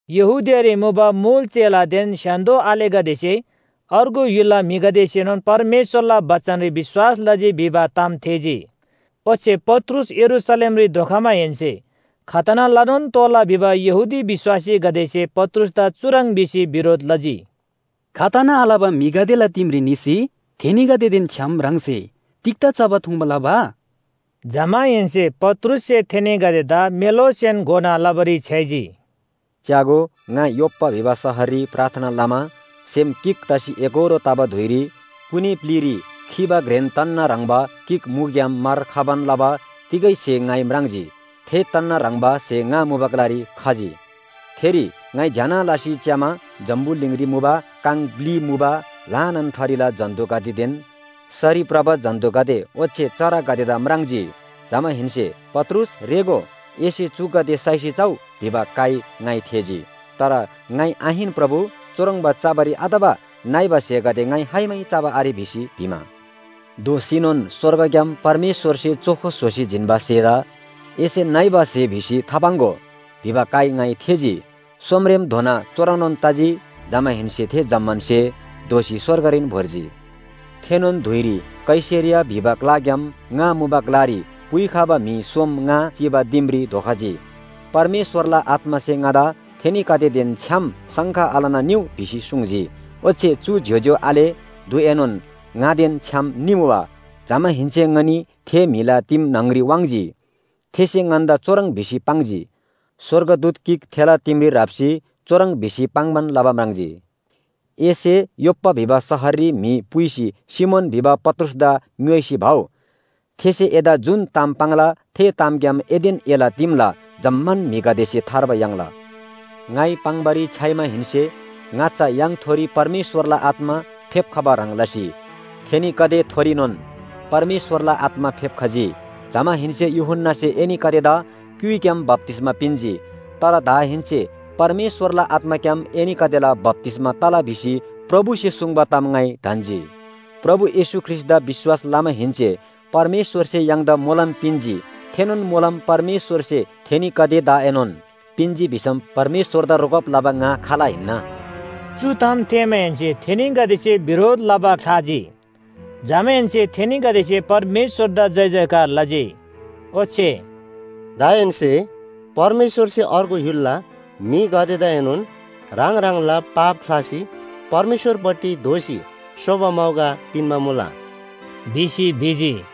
यहूदियारी मुबा मुल चेलादेन स्‍य्‍हान्‍दो आलेगदेसे अर्गु य्‍हुलला म्‍हिगदेसेनोन परमेश्‍वरला बचनरी विश्‍वास लजी भिबा ताम थेःजी। ओच्‍छे पत्रुस यरूशलेमरी धोखमाहेन्‍से खतना लनोन तोःला भिबा यहूदी विश्‍वासीगदेसे पत्रुसदा चुह्रङ् भिसी बिरोध लजी, “खतना आलबा म्‍हिगदेला दिमरी निसी थेनीगदेदेन छ्‌याम ह्राङसे तिग्‍दा चबा थुङ्बा लबा?” जमाहेन्‍से पत्रुससे थेनीगदेदा मेलोसेन घोना लबारी छ्‌याइजी। “च्‍यागो, ङा योप्‍पा भिबा शहररी प्रार्थना लमा सेम गिक तसी एकोहोरो तबा धुइरी कुनी ब्‍लिरी खीबा घ्रेन तन्‍ना ह्रङ्‌बा गिक मुग्‍याम मार खबान लबा तिगै स्‍हे ङाइ म्राङ्जी, थे तन्‍ना ह्रङ्‌बा स्‍हे ङा मुबा ग्‍लारी खजी। थेरी ङाइ ज्‍यना लसी च्‍यामा जम्‍बुलिङरी मुबा काङ ब्‍लि मुबा ल्‍हानान थरीला जन्‍तुगदेदेन सरी भ्रबा जन्‍तुगदे ओच्‍छे चरागदेदा म्राङ्जी। जमाहेन्‍से ‘पत्रुस रेःगो, एसे चुगदे साइसी चउ’ भिबा काइ ङाइ थेःजी। “तर ङाइ ‘आहिन प्रभु, चुह्रङ्बा चबारी आतबा नइबा स्‍हेगदे ङाइ खाइमै चबा आरे’ भिसी भिमा, “दोःसीनोन स्‍वर्गग्‍याम परमेश्‍वरसे चोखो स्‍होसी जिन्‍बा स्‍हेदा एसे नइबा स्‍हे भिसी थापाङ्‍गो भिबा काइ ङाइ थेःजी। सोमरेमधोना चुह्रङ्‌नोन तजी, जमाहेन्‍से थे जम्‍मान स्‍हे दोःसी स्‍वर्गरीन भोर्जी। “थेनोन धुइरी कैसरिया भिबा ग्‍लाग्‍याम ङा मुबा ग्‍लारी पुइखबा म्‍हि सोम ङा चिबा दिमरी धोखजी। परमेश्‍वरला आत्‍मासे ङादा थेनीगदेदेन छ्‌याम शङ्का आलना निउ भिसी सुङ्जी। ओच्‍छे चु ज्‍योज्‍यो आले ढुएनोन ङादेन छ्‌याम निमुबा, जमाहेन्‍से ङनी थे म्‍हिला दिम न्‍हङरी वाङ्‌जी। थेसे ङन्‍दा चुह्रङ् भिसी पाङ्जी, स्‍वर्गदूत गिक थेला दिमरी राप्‍सी चुह्रङ् भिसी पाङ्‌बान लबा म्राङ्जी, ‘एसे योप्‍पा भिबा शहररी म्‍हि पुइसी सिमोन भिबा पत्रुसदा ङ्‌योइसी भउ। थेसे एदा जुन ताम पाङ्ला थे तामग्‍याम एदेन एला दिमला जम्‍मान म्‍हिगदेसे थार्बा याङ्ला।’ “ङाइ पाङ्‌बारी छ्‌याइमाहेन्‍से, ङाच्‍छा य्‍हाङथोरी परमेश्‍वरला आत्‍मा फेप्‍खबा ह्रङ् लसी थेनीगदेथोरीनोन परमेश्‍वरला आत्‍मा फेप्‍खजी। जमाहेन्‍से ‘यूहन्‍नासे एनीगदेदा क्‍युइग्‍याम बप्‍तिस्‍मा पिन्‍जी, तर दाहेन्‍से परमेश्‍वरला आत्‍माग्‍याम एनीगदेला बप्‍तिस्‍मा तला’ भिसी प्रभुसे सुङ्बा ताम ङाइ ढन्‍जी। प्रभु येशू ख्रीष्‍टदा विश्‍वास लमाहेन्‍से परमेश्‍वरसे य्‍हाङदा मोलम पिन्‍जी, थेनोन मोलम परमेश्‍वरसे थेनीगदेदाएनोन पिन्‍जी भिसम परमेश्‍वरदा रोकब लबा ङा खाल हिन्‍ना?” चु ताम थेःमाहेन्‍से थेनीगदेसे बिरोध लबा ख्‍लाजी, जमाहेन्‍से थेनीगदेसे परमेश्‍वरदा जयजयकार लजी, ओच्‍छे “दाहेन्‍से परमेश्‍वरसे अर्गु य्‍हुलला म्‍हिगदेदाएनोन ह्राङ ह्राङला पाप ख्‍लासी परमेश्‍वरपट्टि दोःसी सोबा मौका पिन्‍बा मुला” भिसी भिजी।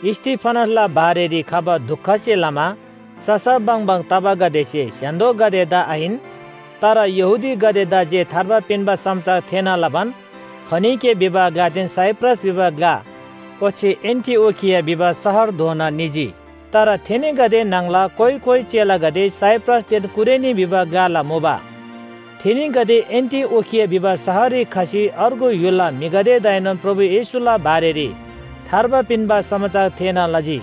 स्‍तिफनसला बारेरी खबा दुखसे लमा ससा बङबङ तबागदेसे स्‍य्‍हान्‍दोगदेदा आहिन, तर यहूदीगदेदा जे थार्बा पिन्‍बा समाचार थेःना लबान, फोनिके भिबा ग्‍लादेन साइप्रस भिबा ग्‍ला ओच्‍छे एन्‍टिओखिया भिबा शहरधोना निजी। तर थेनीगदे न्‍हङला कोइ कोइ चेलागदे साइप्रसदेन कुरेनी भिबा ग्‍लाला मुबा। थेनीगदे एन्‍टिओखिया भिबा शहररी खसी अर्गु य्‍हुलला म्‍हिगदेदाएनोन प्रभु येशूला बारेरी थार्बा पिन्‍बा समाचार थेःना लजी।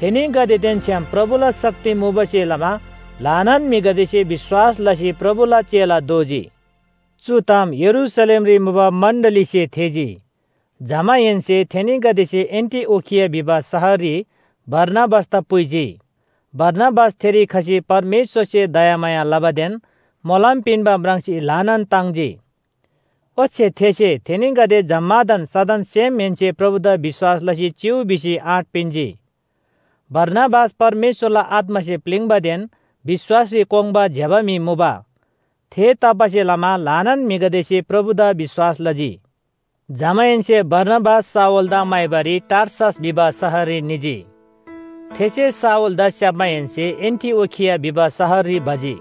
थेनीगदेदेन छ्‌याम प्रभुला शक्ति मुबासे लमा ल्‍हानान म्‍हिगदेसे विश्‍वास लसी प्रभुला चेला दोजी। चु ताम यरूशलेमरी मुबा मण्‍डलीसे थेःजी, जमाहेन्‍से थेनीगदेसे एन्‍टिओखिया भिबा शहररी बारनाबासदा पुइजी। बारनाबास थेरी खसी परमेश्‍वरसे दयामाया लबादेन मोलम पिन्‍बा म्राङ्सी ल्‍हानान ताङ्जी। ओच्‍छे थेसे थेनीगदे जम्‍मादान सदन सेमहेन्‍से प्रभुदा विश्‍वास लसी चिउ भिसी आँट पिन्‍जी। बारनाबास परमेश्‍वरला आत्‍मासे प्‍लिङ्‌बादेन विश्‍वासरी कोङ्बा ज्‍यबा म्‍हि मुबा। थेतबासेलमा ल्‍हानान म्‍हिगदेसे प्रभुदा विश्‍वास लजी। जमाहेन्‍से बारनाबास शाऊलदा म्‍हाइबारी टार्सस भिबा शहररी निजी। थेसे शाऊलदा स्‍याप्‍माहेन्‍से एन्‍टिओखिया भिबा शहररी भजी।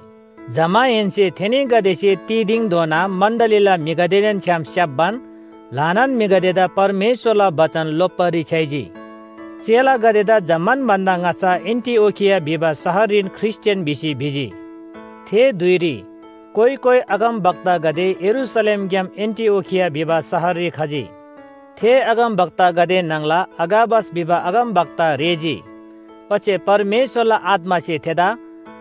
जमाहेन्‍से थेनीगदेसे तिदिङधोना मण्‍डलीला म्‍हिगदेदेन छ्‌याम स्‍याप्‍बान ल्‍हानान म्‍हिगदेदा परमेश्‍वरला बचन लोप्‍बारी छ्‌याइजी। चेलागदेदा जम्‍मान भन्‍दा ङाच्‍छा एन्‍टिओखिया भिबा शहररीन ख्रीष्‍टियान भिसी भिजी। थे धुइरी कोइ कोइ अगमवक्तागदे यरूशलेमग्‍याम एन्‍टिओखिया भिबा शहररी खजी। थे अगमवक्तागदे न्‍हङला अगाबस भिबा अगमवक्ता रेःजी, ओच्‍छे परमेश्‍वरला आत्‍मासे थेदा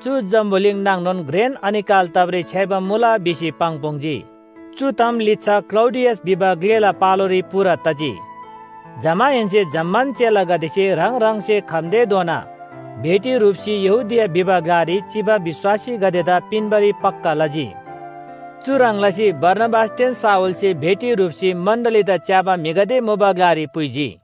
चु जम्‍बुलिङ नाङनोन घ्रेन अनिकाल तबारी छ्‌याइबा मुला भिसी पाङ्‌पुङ्‌जी। चु ताम लिच्‍छा क्‍लौडियस भिबा ग्‍लेला पालोरी पूरा तजी। जमाहेन्‍से जम्‍मान चेलागदेसे ह्राङ ह्राङसे खम्‍तेधोना भेटी ह्रुप्‍सी यहूदिया भिबा ग्‍लारी चिबा विश्‍वासीगदेदा पिन्‍बारी पक्‍का लजी। चुह्रङ् लसी बारनाबासदेन शाऊलसे भेटी ह्रुप्‍सी मण्‍डलीदा च्‍याबा म्‍हिगदे मुबा ग्‍लारी पुइजी।